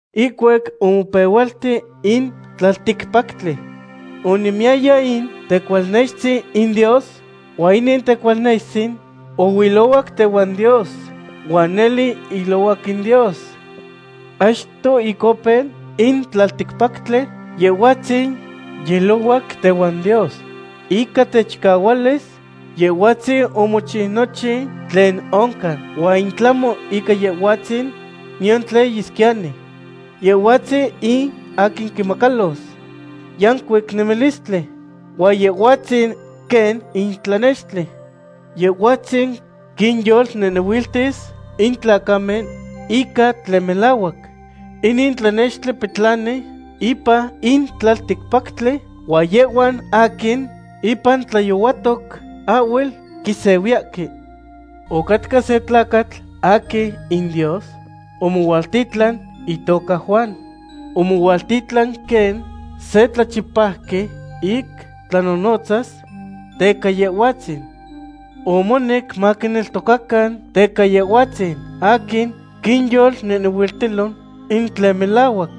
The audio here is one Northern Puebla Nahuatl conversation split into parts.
Ihcuac omopehualti in tlalticpactli, onemiyaya in Tecualnextzin in Dios, huan inin Tecualnextzin oilohuac tehuan Dios, huan nele ilohuac in Dios. Achto ic opeu in tlalticpactli, Yehhuatzin yiilohuac tehuan Dios. Ica techicahualis Yehhuatzin omochiu nochin tlen oncan, huan in tlahmo ica Yehhuatzin, niyan tlen yesquiyani. Yehhuatzin in aquin quinmacalos yancuic nemilistli, huan Yehhuatzin quen in tlanextli. Yehhuatzin quinyolnehnehuiltis in tlacamen ica tlen melahuac. Inin tlanextli petlani ipan in tlalticpactli, huan yehhuan aquin impan tlayohuatoc ahhuel quisehuiyahque. Ocatca se tlacatl aquin in Dios omohualtitlan, itoca Juan. Omohualtitlan quen se tlachipauqui ic tlanonotzas teca Yehhuatzin. Omonec maquineltocacan teca Yehhuatzin aquin quinyolnehnehuiltilo in tlen melahuac.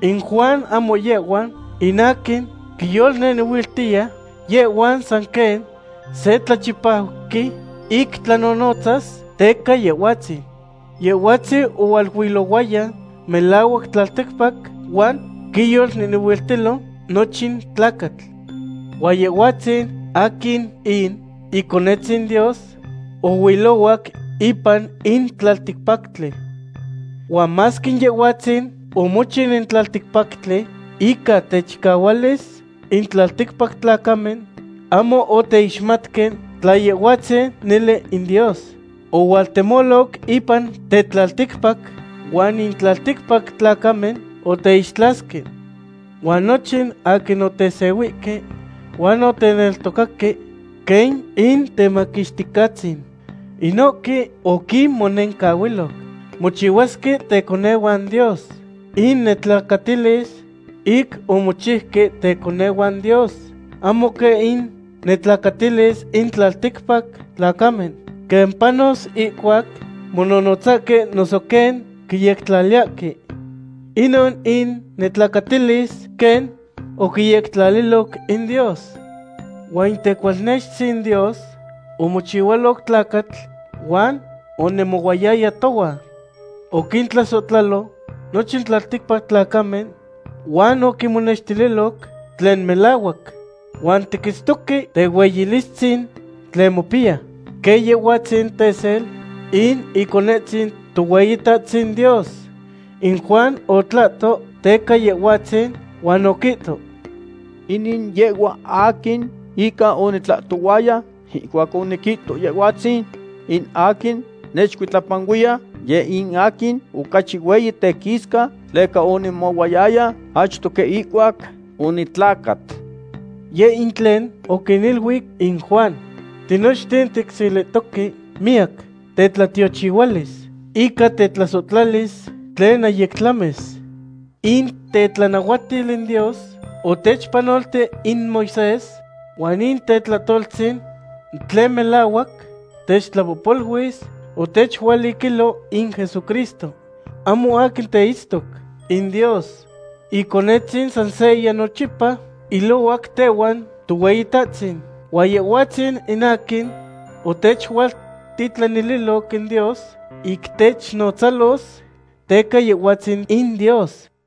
In Juan ahmo yehhua in aquin quinyolnehnehuiltiya; yehhua san quen se tlachipauqui ic tlanonotzas teca Yehhuatzin. Yehhuatzin ohualuilohuaya melahuac tlalticpac, huan quinyolnehnehuiltilo nochin tlacatl. Huan Yehhuatzin aquin in Iconetzin Dios oilohuac ipan in tlalticpactli. Huan masque Yehhuatzin omochiu in tlalticpactli ica techicahualis, in tlalticpac tlacamen ahmo oteixmatque tla Yehhuatzin nele in Dios. Ohualtemoloc ipan tetlalticpac, huan in tlalticpac tlacamen oteixtlasque. Huan nochin aquin otesehuihque huan oteneltocaque quen Intemaquixticahtzin, inohque oquinmonencahuiloc mochihuasque teconehuan Dios. In netlacatilis ic omochiuque teconehuan Dios ahmo quen in netlacatilis in tlalticpac tlacamen, quen panos ihcuac mononotzahque noso quen quiyectlaliyahque. Inon in netlacatilis quen oquiyectlaliloc in Dios. Huan in Tecualnextzin Dios omochihualoc tlacatl huan onemohuayaya tohuan. Oquintlasohtlalo nochin tlalticpac tlacamen huan oquinmonextililoc tlen melahuac. Huan tiquitztoque tehueyilistzin tlen mopiya, quen Yehhuatzin tesel in Iconetzin Tohueyitahtzin Dios. In Juan otlahto teca Yehhuatzin, huan oquihto: ―Inin yehhua aquin ica onitlahtohuaya ihcuac oniquihto Yehhuatzin in aquin nechcuitlapanuiya, yeh in aquin ocachi hueyi tequisca, tleca onemohuayaya achto quen ihcuac onitlacat. Yeh in tlen oquiniluic in Juan. Tinochten ticselihtoque miyac tetlatiochihualis ica tetlasohtlalis tlen ahyic tlamis. In tetlanahuatil in Dios otechpanolti in Moisés, huan in tetlahtoltzin tlen melahuac techtlahtlapoluis otechualiquilo in Jesucristo. Ahmo aquin teitztoc in Dios. Iconetzin san seya nochipa ilohuac tehuan Tohueyitahtzin, huan Yehhuatzin in aquin otechualtitlanililoc in Dios ic technotzalos teca Yehhuatzin in Dios.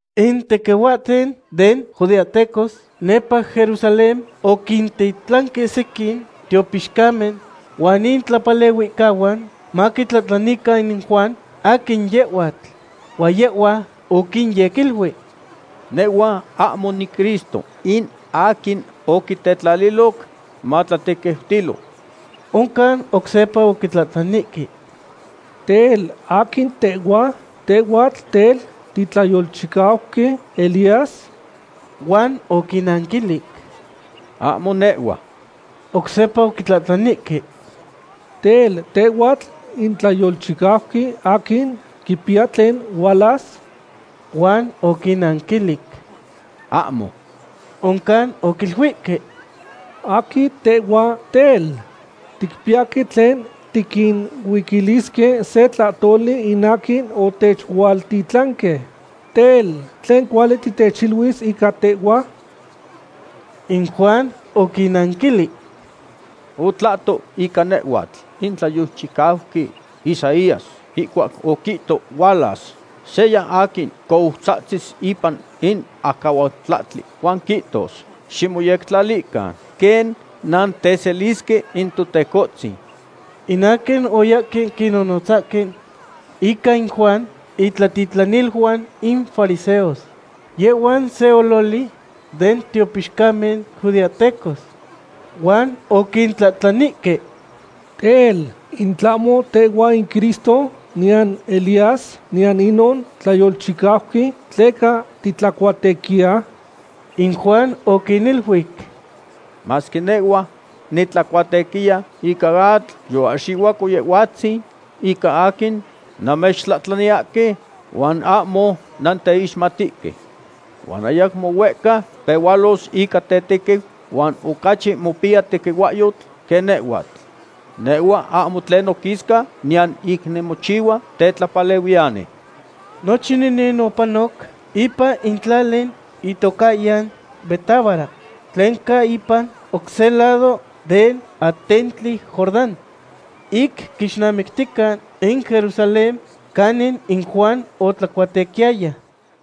In tequihuahten den judeahtecos nepa Jerusalén oquintitlanque sequin tiopixcamen huan intlapalehuihcahuan, maquitlahtlanican in Juan aquin yehhuatl. Huan yehhua oquinyequiluic: ―Nehhua ahmo niCristo in aquin oquitetlaliloc matlatequiutilo. Oncan oc sepa oquitlahtlanihque: ―Tel, ¿aquin tehhua? ¿Tehhua tel titlayolchicauqui Elías? Huan oquinnanquilic: ―Ahmo nehhua. Oc sepa oquitlahtlanihque: ―Tel, ¿tehhuatl in tlayolchicauqui aquin quipiya tlen hualas? Huan oquinnanquilic: ―Ahmo. Oncan oquiluihque: ―¿Aquin tehhua, tel? Ticpiyahque tlen tiquinuiquilisque se tlahtoli in aquin otechualtitlanque. Tel, ¿tlen cuali titechiluis ica tehhua? In Juan oquinnanquilic: ―Otlahto ica nehhuatl in tlayolchicauqui Isaías ihcuac oquihto hualas seya aquin coutzahtzis ipan in acahualtlahtli huan quihtos: “Ximoyectlalican quen nanteselisque in Totecohtzin.” In aquin oyahque quinonotzahque ica in Juan intlatitlaniluan in fariseos. Yehhuan se ololi den tiopixcamen judeahtecos. Huan oquitlahtlanihque: ―Tel, ¿in tlahmo tehhuatl in Cristo, niyan Elías, niyan inon tlayolchicauqui, tleca titlacuatequiya? In Juan oquiniluic: ―Masque nehhua nitlacuatequiya ica atl, yoahxihuaco Yehhuatzin ica aquin nannechtlahtlaniyahque, huan ahmo nanteixmatihque. Huan ayacmo huehca pehualos ica tetequiu, huan ocachi mopiya tequihuahyotl quen nehhuatl. Nehhua ahmo tlen noquisca niyan ic nimochihua tetlapalehuiyani. Nochin inin opanoc ipan in tlali itocahyan Betábara, tlen ca ipan oc se lado den atentli Jordán, ic quixnamictica in Jerusalén canin in Juan otlacuatequiyaya.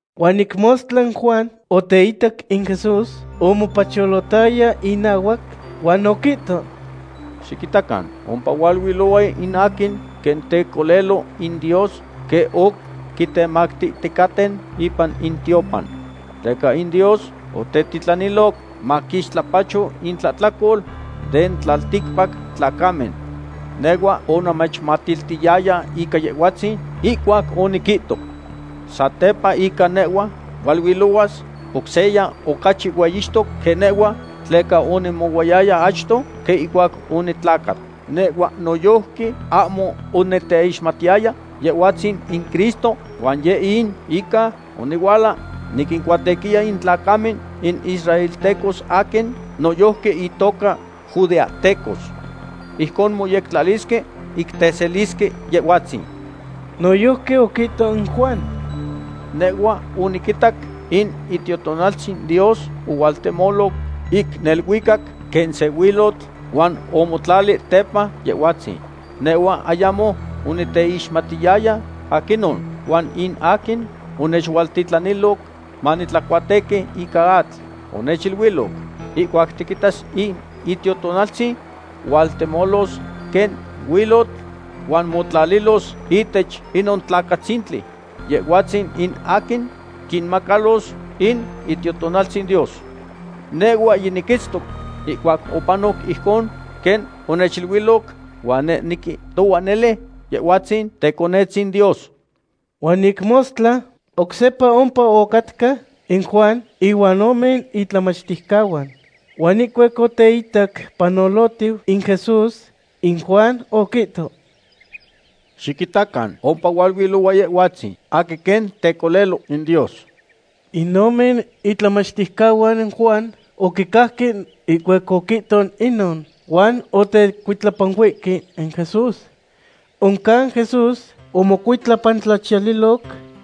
Huan ic mostla in Juan oteitac in Jesús omopacholotaya inahuac, huan oquihto: ―Xiquitacan, ompa hualuilohua in aquin quen Tecolelo in Dios quen oc quitemactihticaten ipan in tiopan. Tleca in Dios otetitlaniloc maquixtlapacho intlahtlacol den tlalticpac tlacamen. Nehhua onamechmatiltiyaya ica Yehhuatzin ihcuac oniquihto: “Satepa ica nehhua hualuilohuas oc seya ocachi hueyixtos quen nehhua, tleca onemohuayaya achto quen ihcuac onitlacat.” Nehhua noyojqui ahmo oniteixmatiyaya Yehhuatzin in Cristo, huan yeh in ica onihuala niquincuatequiya in tlacamen, in israeltecos aquin noyojqui intoca judeahtecos. Ijcon moyectlalisque ic teselisque Yehhuatzin. Noyojqui oquihto in Juan: ―Nehhua oniquitac in Itiotonaltzin Dios ohualtemoloc ic neluicac quen se huilotl, huan omotlali tepa Yehhuatzin. Nehhua ayamo oniteixmatiyaya aquinon, huan in aquin onechualtitlaniloc manitlacuatequi ica atl onechiluiloc: “Ihcuac tiquitas in Itiotonaltzin hualtemolos quen huilotl huan motlalilos ihtech inon tlacatzintli, Yehhuatzin in aquin quinmacalos in Itiotonaltzin Dios.” Nehhua yiniquitztoc ihcuac opanoc ijcon quen onechiluiloc, huan neh niquihtohua nele Yehhuatzin Teconetzin Dios. Huan ic mostla, oc sepa ompa ocatca in Juan ihuan ome itlamachticahuan. Huan ihcuac oteitac panolitiu in Jesús, in Juan oquihto: ―Xiquitacan, ompa hualuilohua Yehhuatzin aquin quen Tecolelo in Dios. In ome itlamachticahuan Juan oquicajque ihcuac oquihto inon, huan otecuitlapanuihque in Jesús. Oncan Jesús omocuitlapantlachiyaliloc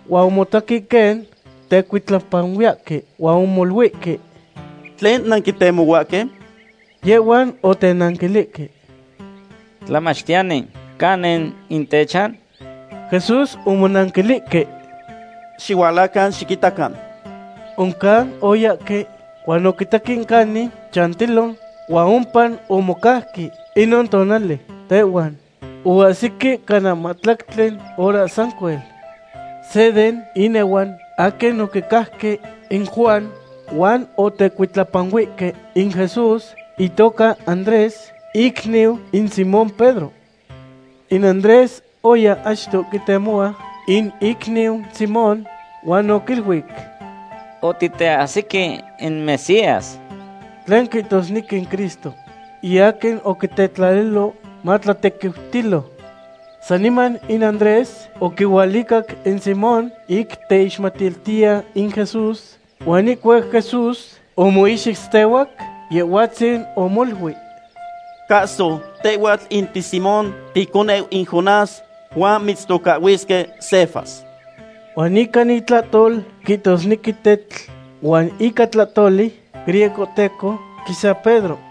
huan omotaque quen tecuitlapanuiyahque, huan omoluihque: ―¿Tlen nanquitemohuahque? Yehhuan otenanquilihque: ―Tlamachtiyani, ¿canin in techan? Jesús omonanquilihque: ―Xihualacan xiquitacan. Oncan oyahque huan oquitaque canin chantilo huan ompa omocauque inon tonali tehuan, oahsique cana mahtlactli hora sancuel. Se den inehuan aquin oquicajque in Juan huan otecuitlapanuihque in Jesús itoca Andrés, icniu in Simón Pedro. In Andrés oya achto quitemohua in icniu Simón huan oquiluic: ―Otiteahsique in Mesías, tlen quihtosnequi in Cristo, in aquin oquitetlaliloc matlatequiutilo. Saniman in Andrés oquihualicac in Simón ic teixmatiltiya in Jesús, huan ihcuac Jesús omoixitztehuac, Yehhuatzin omoluic: ―Cahso, tehhuatl in tiSimón, ticoneu in Jonás, huan mitztocahhuisque Cefas. Huan ica intlahtol quihtosnequi tetl. Huan ica tlahtoli griegohteco quisa Pedro.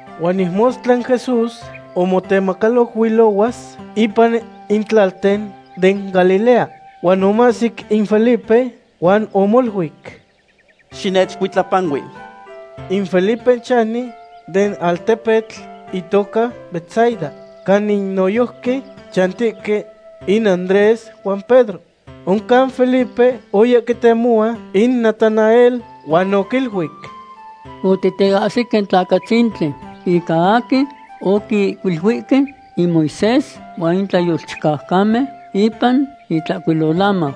Huan ic mostla in Jesús omotemacaloc huilohuas ipan in tlalten den Galilea, huan omahsic in Felipe huan omoluic: ―Xinechcuitlapanui. In Felipe chani den altepetl itoca Betsaida, canin noyojqui chantihque in Andrés huan Pedro. Oncan Felipe oya quitemohua in Natanael huan oquiluic: ―Otiteahsique in tlacatzintli ica aquin oquihcuiluihque in Moisés huan in tlayolchicaucamen ipan Intlahcuilolamau.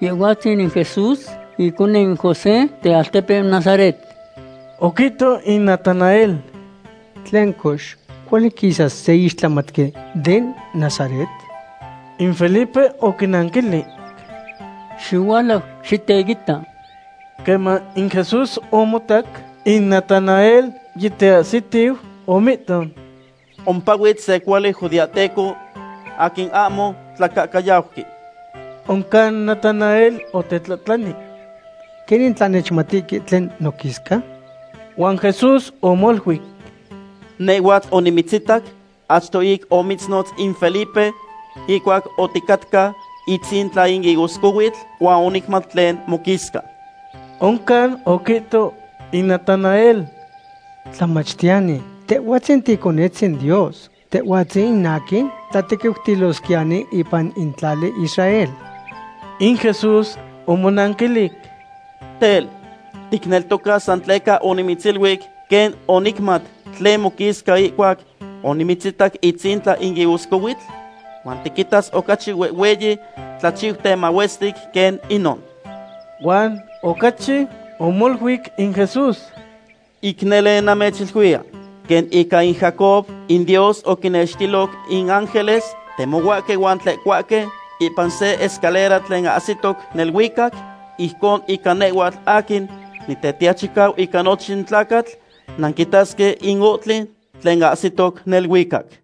Yehhuatzin in Jesús iconeu in José, tealtepeu Nazaret. Oquihto in Natanael: ―Tlen cox, ¿cuali quisas se ixtlamatqui den Nazaret? In Felipe oquinanquilic: ―Xihualau xiteita. Queman in Jesús omotac in Natanael yiteahsitiu, omihto: ―Ompa huitz se cuali judeahteco aquin ahmo tlacahcayauqui. Oncan Natanael otetlahtlani: ―¿Quenin tla nechmatihque tlen noquisca? Huan Jesús omoluic: ―Nehhua onimitzitac achto ic omitznotz in Felipe, ihcuac oticatca itzintla in higoscohuitl, huan onicmat tlen moquisca. Oncan oquihto in Natanael: ―Tlamachtiyani, Tehhuatzin Ticonetzin Dios; Tehhuatzin in aquin tlatequiutilosquiyani ipan in tlali Israel. In Jesús omonanquilic: ―Tel, ¿ticneltoca san tleca onimitziluic quen onicmat tlen moquisca ihcuac onimitzitac itzintla in higoscohuitl? Huan tiquitas ocachi huehhueyi tlachiuten mahuestic quen inon. Huan ocachi omoluic in Jesús: ―Ic nele namechiluiya, quen ica in Jacob, in Dios oquinextiloc in ángeles temohuahque huan tlehcohuahque ipan se escalera tlen ahsitoc neluicac, ijcon ica nehhuatl aquin Nitetiachicau ica nochin tlacatl nanquitasque in ohtli tlen ahsitoc neluicac.